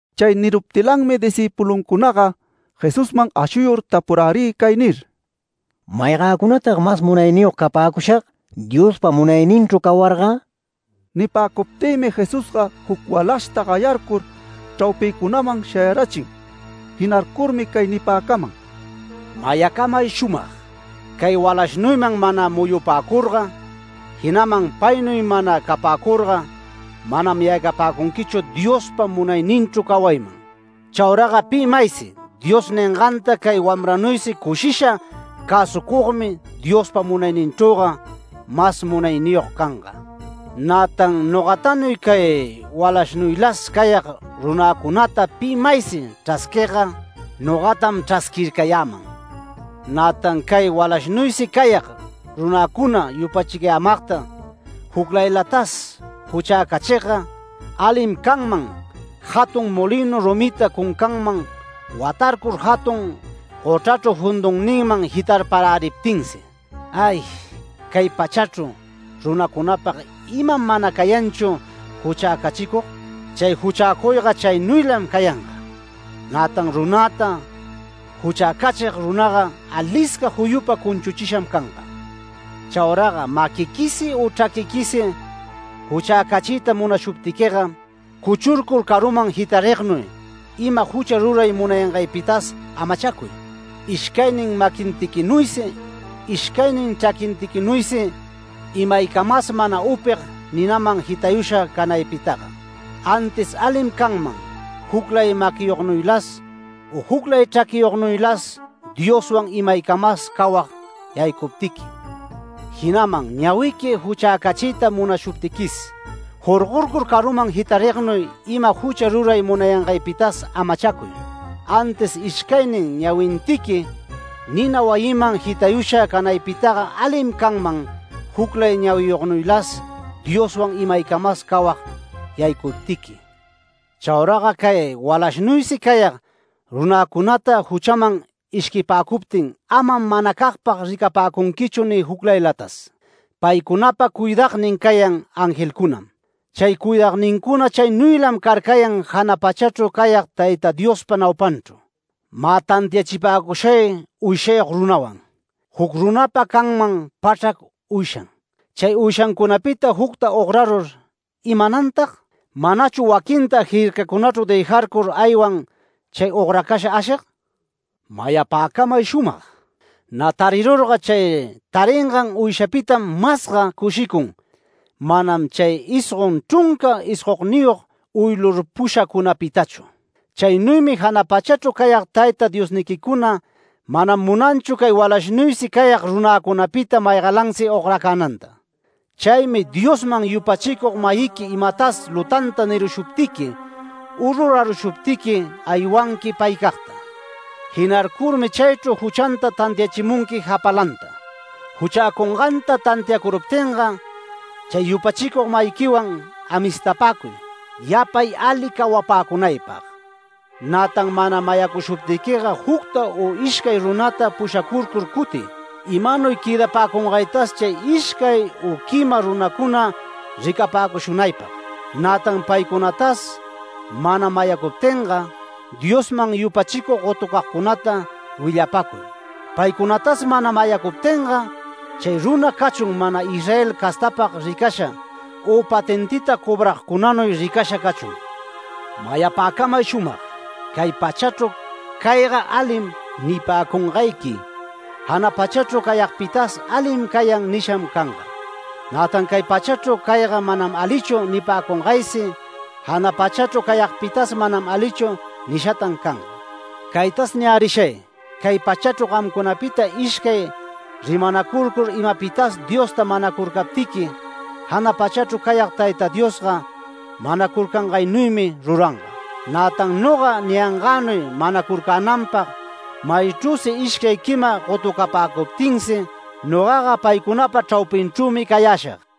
Chay niruptilanmi discïpuluncunaga Jesusman ashuyur tapurärï cay nir: “¿Maygäcunatag mas munayniyog capäcushag Diospa munayninchru cawarga?” Nipäcuptïmi Jesusga juc walashta gayarcur chraupïcunaman shayarachin. Jinarcurmi cay nipäcaman: “Mayapäcamay shumag: Cay walashnuyman mana muyupacurga, jinaman paynuy mana capäcurga manam yaycapäcunquichu Diospa munayninchru cawayman. Chauraga pi maysi Dios ninganta cay wamranuysi cushisha cäsucugmi Diospa munayninchrüga mas munayniyog canga. Nätan nogatanuy cay walashnuylas cayag runäcunata pi maysi chrasquigga, nogatam chrasquircayäman. Nätan cay walashnuysi cayag runäcuna yupachicayämagta juclaylatas juchäcachigga, alim canman jatun molinu rumita cuncanman watarcur jatun gochrachru jundunninman jitarparäriptinsi”. “¡Ay, cay pachachru runacunapag iman mana cayanchu juchäcachicug! Chay juchäcuyga chaynuylam cayanga. Nätan runäta juchäcachig runaga alisca juyupa cunchuchisham canga. Chauraga maquiquisi u chraquiquisi juchäcachiyta munashuptiquiga, cuchurcur caruman jitarignuy ima jucha ruray munayangaypitas amachacuy. Ishcaynin maquintiquinuysi ishcaynin chraquintiquinuysi imaycamas mana upig ninaman jitayusha canaypitaga. Antis alim canman juclay maquiyognuylas u juclay chraquiyognuylas Dioswan imaycamas cawag yaycuptiqui. Jinaman ñawiqui juchäcachiyta munashuptiquis, jorgorcur caruman jitarignuy ima jucha ruray munayangaypitas amachacuy. Antis ishcaynin ñawintiqui nina wayiman jitayusha canaypitaga alim canman juclay ñawiyognuylas Dioswan imaycamas cawag yaycuptiqui”. “Chauraga cay walashnuysi cayag runäcunata juchaman ishquipäcuptin amam manacagpag ricapäcunquichu ni juclaylatas. Paycunapa cuidagnin cayan angelcunam. Chay cuidagnincuna chaynuylam carcayan jana pachachru cayag Tayta Diospa naupanchru. Mä tantiachipäcushay uyshayog runawan: Juc runapa canman pachrac uyshan. Chay uyshacunapita jucta ograrur ¿imanantag? ¿Manachu waquinta jircacunachru dëjarcur aywan chay ogracasha ashig? Mayapäcamay shumag: Nä tarirurga, chay taringan uyshapitam masga cushicun manam chay isgon chrunca isgonniyog uylurpushacunapitachu. Chaynuymi jana pachachru cayag Tayta Diosniquicuna mana munanchu cay walashnuysi cayag runäcunapita maygalansi ogracänanta. Chaymi Diosman yupachicug-mayiqui imatas lutanta nirushuptiqui u rurarushuptiqui aywanqui paycagta. Jinarcurmi chaychru juchanta tantiachimunqui japalanta. Juchäcunganta tantiacuruptinga chay yupachicug-mayiquiwan, amistapäcuy, yapay ali cawapäcunaypag. Nätan mana mayacushuptiquiga jucta u ishcay runata pushacurcur cutiy, imanuy quëdapäcungaytas chay ishcay u quima runacuna ricapäcushunaypag. Nätan paycunatas mana mayacuptinga, Diosman yupachicug gotucagcunata willapacuy. Paycunatas mana mayacuptinga, chay runa cachun mana Israel castapag ricasha, u patentita cobragcunanuy ricasha cachun. Mayapäcamay shumag: Cay pachachru ‘Cayga alim’ nipäcungayqui, jana pachachru cayagpitas ‘Alim cayan’ nisham canga. Nätan cay pachachru ‘Cayga manam alichu’ nipäcungaysi, jana pachachru cayagpitas ‘Manam alichu’ nishatan canga. Caytas niyärishay: Cay pachachru gamcunapita ishcay rimanacurcur imapitas Diosta manacurcaptiqui, jana pachachru cayag Tayta Diosga manacurcangaynuymi ruranga. Nätan noga niyangänuy manacurcänanpag maychrüsi ishcay quima gotucapäcuptinsi, nogaga paycunapa chraupinchrümi cayäshag”.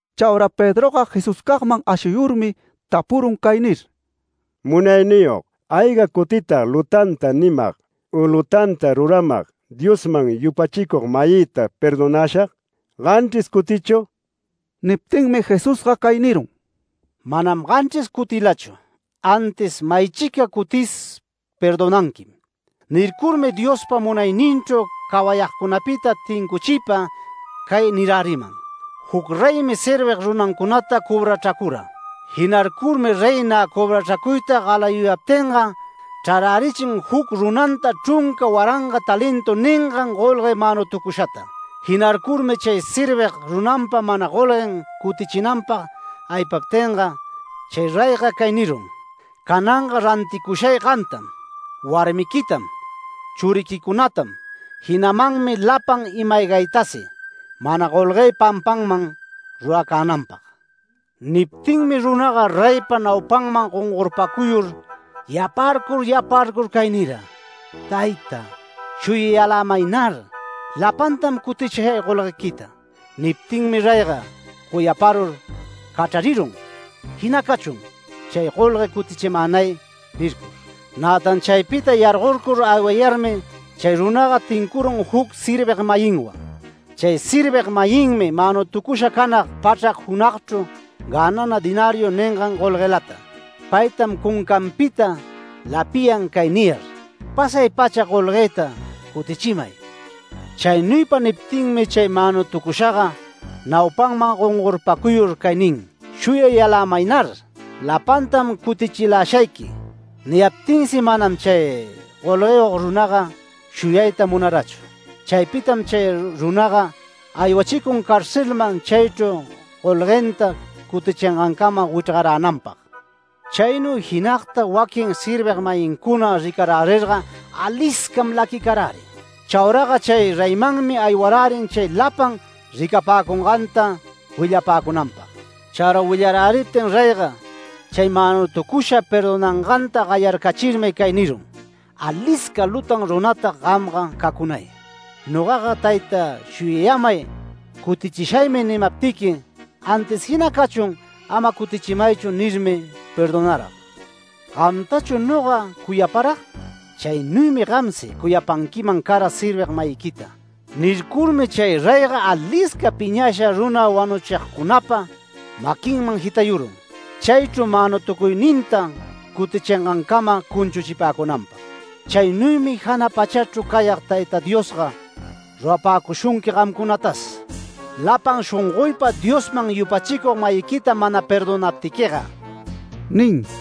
Chaura Pedroga Jesuscagman ashuyurmi tapurun cay nir: “Munayniyog, ¿ayga cutitag lutanta nimag u lutanta ruramag Diosman yupachicug-mayïta perdonashag? ¿Ganchris cutichu?” Niptinmi Jesusga cay nirun: “Manam ganchris cutilachu, antis maychica cutis perdonanquim”. Nircurmi Diospa munayninchru cawayagcunapita tincuchiypa cay niräriman: “Juc reymi servig runancunata cobrachracura. Jinarcurmi rey nä cobrachracuyta galayuyaptinga, chrarärichin juc runanta chrunca waranga talentu ningan golgue manutucushata. Jinarcurmi chay servig runanpa mana golguen cutichinanpag aypaptinga, chay reyga cay nirun: ‘Cananga ranticushay gamtam, warmiquitam, churiquicunatam, jinamanmi lapan ima-aygaytasi, mana golguë pampanman ruracänanpag’. Niptinmi runaga reypa naupanman gongorpacuyur yaparcur yaparcur cay nira: ‘Tayta, shuyayälämaynar, lapantam cutichishay golguequita’. Niptinmi reyga cuyaparur cachrarirun ‘Jina cachun chay golgue cutichimänay’ nircur. Nätan chaypita yargorcur aywayarmi, chay runaga tincurun juc servig-mayinwan. Chay servig-mayinmi manutucusha canag pachrac junagchru gänana ‘denariu’ ningan golguelata. Paytam cuncanpita lapiyan cay niyar: ‘Pasay-pacha golguëta cutichimay’. Chaynuypa niptinmi chay manutucushaga naupanman gongorpacuyur cay nin: ‘Shuyayälämaynar, lapantam cutichilashayqui’. Niyaptinsi manam chay golgueyog runaga shuyayta munarachu. Chaypitam chay runaga aywachicun carcelman chaychru golguenta cutichingancama wichrgaränanpag. Chaynuy jinagta waquin servig-mayincuna ricarärirga aliscam laquicarärin. Chauraga chay reyninmanmi aywarärin chay lapan ricapäcunganta willapäcunanpag. Chaura willaräriptin reyga chay manutucushata perdonanganta gayarcachirmi cay nirun: ‘¡Alisca lutan runatag gamga cacunay! Nogaga “Tayta shuyayämay, cutichishaymi” nimaptiqui, antis “Jina cachun ama cutichimaychu” nirmi perdonarag. Gamtachu noga cuyaparag, chaynuymi gamsi cuyapanquiman cara servig-mayiquita’. Nircurmi chay reyga alisca piñasha runa wanuchigcunapa maquinman jitayurun, chaychru manutucuyninta cutichingancama cunchuchipäcunanpag. Chaynuymi jana pachachru cayag Tayta Diosga rurapäcushunqui gamcunatas, lapan shongoypa Diosman yupachicug-mayiquita mana perdonaptiquiga” nin.